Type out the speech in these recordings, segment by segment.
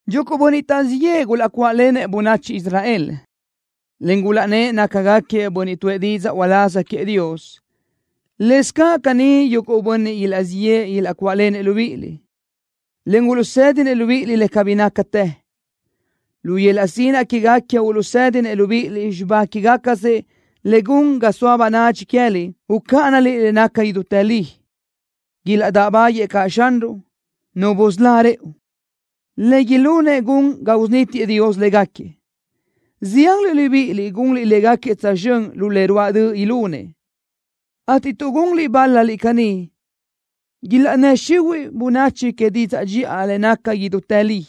Yuguʼ bönniʼ taʼzíʼ yëʼë gulaʼcuáʼlenëʼ bönachi Israel, en gulaʼnnë́ʼ nácagaquiëʼ bönniʼ tuʼë didzaʼ uláz queëʼ Dios. Lëscaʼ caní yuguʼ bönniʼ ilaʼzíʼ yëʼë ilaʼcuáʼlenëʼ libíʼiliʼ, en uluʼsédinëʼ libíʼiliʼ le cabí nácatë. Lu yöl-laʼ sinaʼ quégaquiëʼ uluʼsédinëʼ libíʼiliʼ xibá quégacasëʼ le gun ga soa bönadxi queë́liʼ ucáʼanaliʼ le naca idútë li. Ilaʼdáʼbaguëʼë caʼ Xanruʼ, Nu busölá rëʼu. Le ilunëʼ gun ga usunítiëʼ Dios légaquiëʼ. Zianliʼ libíʼiliʼ gunliʼ légaquiëʼ tsözxö́n lu le ruáʼ döʼ ilunëʼ, ateʼ tuʼ gunliʼ bál-laliʼ caní ilaʼnnë́ xihuiʼ bönachi que didzaʼ dxiʼa le naca idútë li.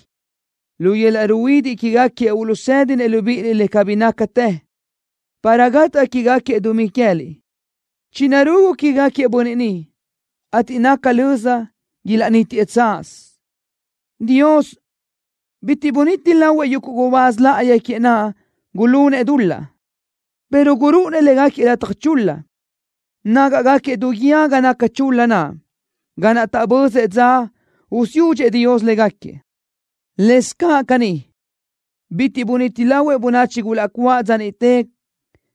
Lu yöl-laʼ ruhuidiʼ quégaquiëʼ uluʼsédinëʼ libíʼiliʼ le cabí nácatë, para gataʼ quégaquiëʼ dumí queë́liʼ. Chinarugu quégaquiëʼ bönniʼ ni, ateʼ naca löza ilaʼnítiëʼ tsaz. Dios bitiʼ buniti lahuëʼ yuguʼ gubáz láʼayi queëʼ naʼ gulunëʼ dul-laʼ, pero gurúʼunëʼ légaquiëʼ lataj chul-la. Nágaʼgaquiëʼ du guíë ga naca chul-la naʼ, ga naʼ taʼbözëʼ dza usiúdxëʼ Dios légaquiëʼ. Lëscaʼ caní, bitiʼ buniti lahuëʼ bönachi gulaʼcuáʼ dza niʼte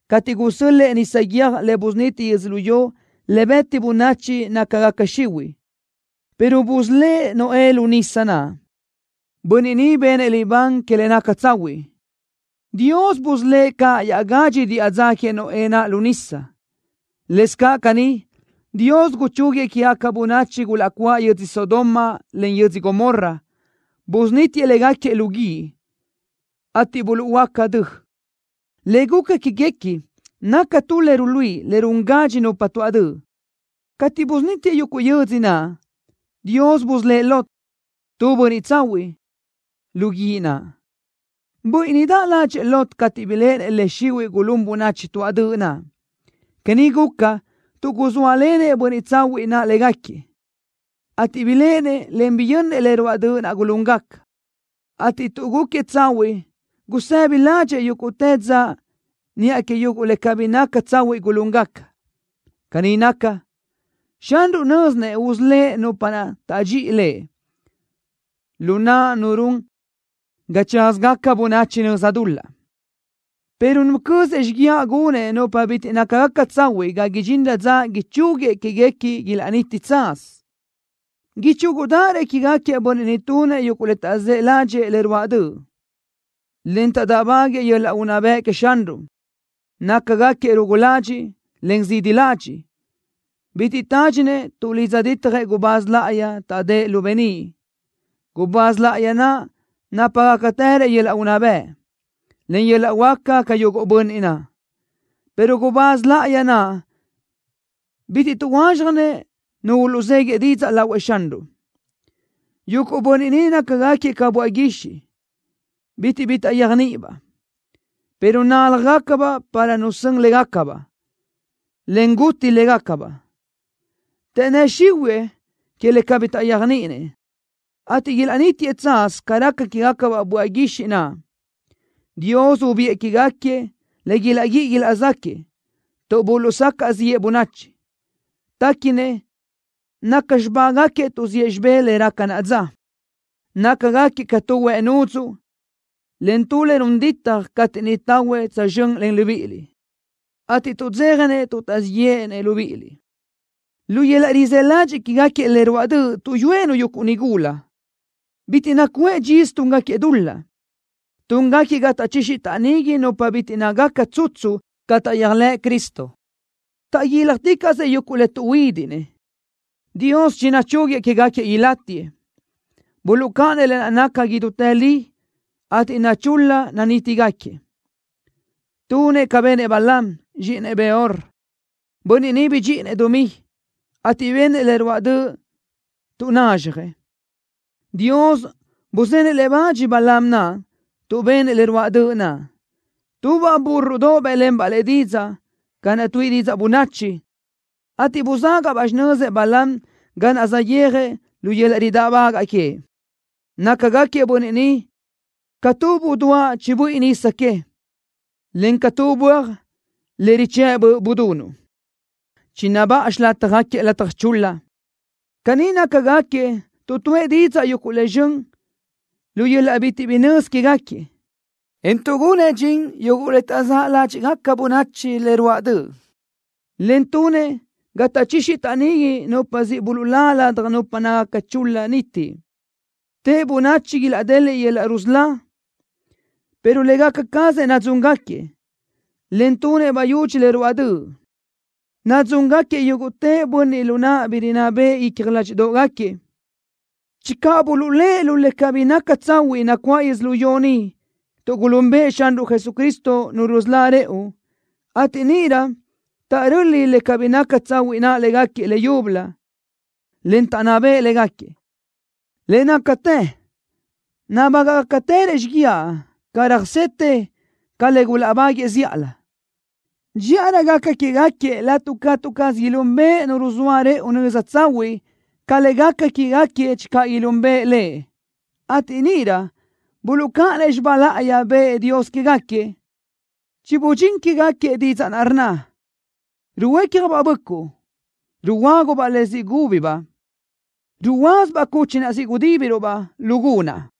cateʼ gusö́l-lëʼë nisa guiö́j le busuniti yödzölió le beti bönachi nácagaca xihuiʼ, pero busölë́ʼ Noé lu nisa naʼ, bönniʼ niʼ benëʼ libán que le naca tsahuiʼ. Dios busölë́ʼ caʼ iaʼgadxi diʼa dza queëʼ Noé naʼ lu nisa. Lëscaʼ caní, Dios guchúguiëʼ quégaca bönachi gulaʼcuáʼ yödzö Sodoma, en yödzö Gomorra. Busunítiëʼ léguequi lu guíʼ, ateʼ buluʼhuöáca dö. Le guca quéguequi naca tu le ruluíʼi le run gadxi nupa tuaʼ döʼ. Cateʼ busunítiëʼ yuguʼ yödzö naʼ, Dios busölë́ʼ Lot, tu bönniʼ tsahuiʼ, lu guíʼ naʼ. Buíʼinidaʼ ládxëʼë Lot cateʼ biléʼenëʼ le xihuiʼ gulún bönachi tuáʼ döʼ naʼ. Caní guca, tuʼ guzóalenëʼ bönniʼ tsahuiʼ naʼ léguequi, ateʼ biléʼenëʼ, en biyönnëʼ le ruáʼ döʼ naʼ gulúngaca, ateʼ tuʼ gúquiëʼ tsahuiʼ gusëbi ládxëʼë yúguʼtë dza niʼa que yuguʼ le cabí naca tsahuiʼ gulúngaca. Caní naca, Xanruʼ nö́zinëʼ usölë́ʼ nupa naʼ tadxi Lëʼ lu naʼ nu run ga tsázagaca bönachi nöza dul-laʼ, pero nucö́zëʼ xíguiaʼ gunëʼ nupa bitiʼ nácagaca tsahuiʼ ga idxinrö dza ichúguiëʼ quéguequi ilaʼniti tsaz. Ichúgudaʼarö quégaquiëʼ bönniʼ ni tunëʼ yuguʼ le taʼzë́ ládxëʼë le ruáʼ döʼ, en taʼdáʼbaguiëʼ yöl-laʼ unná bëʼ queëʼ Xanruʼ. Nácagaquiëʼ rugu ladxiʼ, en zidi ladxiʼ. Bitiʼ tádxinëʼ tuʼlidza ditjëʼ gubáz láʼayi taʼdë́ʼ lu beníʼ. Gubáz láʼayi naʼ nápagacatërëʼ yöl-laʼ unná bëʼ, en yöl-laʼ huáca ca yuguʼ bönniʼ naʼ, pero gubáz láʼayi naʼ bitiʼ tuʼhuázxjanëʼ nu uluʼzéguiëʼ didzaʼ lahuëʼ Xanruʼ. Yuguʼ bönniʼ ni nácagaquiëʼ ca böaʼ guixiʼ, bitiʼ bi taʼyéajniʼibaʼ, pero náljagacabaʼ para nu sön légacabaʼ, en guti légacabaʼ. Taʼnnë́ xihuëʼë que le cabí taʼyéajniʼinëʼ, ateʼ ilaʼnítiëʼ tsaz ca raca quégacabaʼ böaʼ guixiʼ naʼ. Dios ubiʼë quégaquiëʼ le ilaʼguíʼi ilaʼzáquëʼë, tuʼ buluʼsacaʼ ziʼë bönachi. Téquinëʼ naca xibágaquiëʼ tuʼziʼë xibé le raca naʼa dza. Nácagaquiëʼ ca tu huëʼ nudzuʼ, en tu le run ditaj cateʼ niʼ tahuëʼ tsözxö́n len libíʼiliʼ, ateʼ tuʼdzéjanëʼ tuʼ taʼzíʼ yéʼenëʼ libíʼiliʼ. Lu yöl-laʼ rizë́ ladxiʼ quégaquiëʼ le ruáʼ döʼ tuʼyúëʼ-nu yuguʼ nigula. Bitiʼ nacuʼë dxisö túngaquiëʼ dul-laʼ. Túngaquiëʼ ga taʼchixi taʼnigui nupa bitiʼ nácagaca tsutsu ca taʼyéajlëʼ Cristo. Taʼguíljaticaʼsëʼ yuguʼ le tuʼhuídiʼnëʼ. Dios chinuchúguiëʼ quégaquiëʼ ilátigaquiëʼ. Buluʼcáʼanëʼ le naca idútë li, ateʼ nachul-la nanítigaquiëʼ. Tunëʼ ca benëʼ Balaam, zxíʼinëʼ Beor, bönniʼ niʼ bidxíʼinëʼ dumí, ateʼ benëʼ le ruáʼ döʼ tuʼ nazxjëʼ. Dios buzenëʼ le bach Balaam naʼ tuʼ benëʼ le ruáʼ döʼ naʼ. Tubaʼ búrrodoʼ bë́ʼlenbaʼ lëʼ didzaʼ ca naʼ tuíʼi didzaʼ bönachi, ateʼ buzágaʼbaʼ xinözëʼ Balaam ga naʼ saʼyéajëʼ lu yöl-laʼ ridáʼbagaʼ queëʼ. Nácagaquiëʼ bönniʼ ni ca tu buduáʼ chibuíʼi nisa que, encaʼ ca tu böaj le richë́ʼ böʼ budunuʼ. Chinabáʼa xilátjagaquiëʼ lataj chul-la. Caní nácagaquiëʼ tuʼ tuʼë didzaʼ yuguʼ le zxön lu yöl-laʼ bitiʼ bi nözi quégaquiëʼ, en tuʼgunëʼ dxin yuguʼ le taʼzë́ ládxiʼgaca bönachi le ruáʼ döʼ, en tunëʼ ga taʼchixi taʼnigui nupa siʼ buluʼlá ladaj nupa nácagaca chul-la niti. Tëʼ bönachi ilaʼdeliʼ yöl-laʼ rusölá, pero légaca cazëʼ nadzúngaquiëʼ, en tunëʼ bayudxi le ruáʼ döʼ. Nadzúngaquiëʼ yúguʼtë bönniʼ lu naʼ bi rinná beʼe icja ládxiʼdoʼgaquiëʼ. Channö buluʼlë́ʼ lu le cabí naca tsahuiʼ nacuáʼ yödzölió ni tuʼ gulúnbëʼë Xanruʼ Jesucristo, Nu rusölá rëʼu, ateʼ níʼirö taʼröli le cabí naca tsahuiʼ naʼ légaquiëʼ leyúbölö, en taʼnná beʼe légaquiëʼ, le nácatë nabágaʼgacatërëʼ xíguiaʼ ga röjsetë ca le gulaʼbáguëʼë zíʼalö. Dxíʼarö gaca quégaquiëʼ laʼtuʼ catu caz ilúnbëʼë Nu ruzóa rëʼu nöza tsahuiʼ ca le gaca quégaquiëʼ channö gulúnbëʼë Lëʼ, ateʼ níʼirö buluʼcáʼanëʼ xibá láʼayi bëʼë Dios quégaquiëʼ. Chibudxín quégaquiëʼ didzaʼ naʼ rnna: Ruhuécjabaʼ böʼcuʼ, ruhuöágubaʼ le siʼ gúbabaʼ. Ruyázabaʼ cuchi naʼ siʼ gudíbiruʼ-baʼ lu gunaʼ.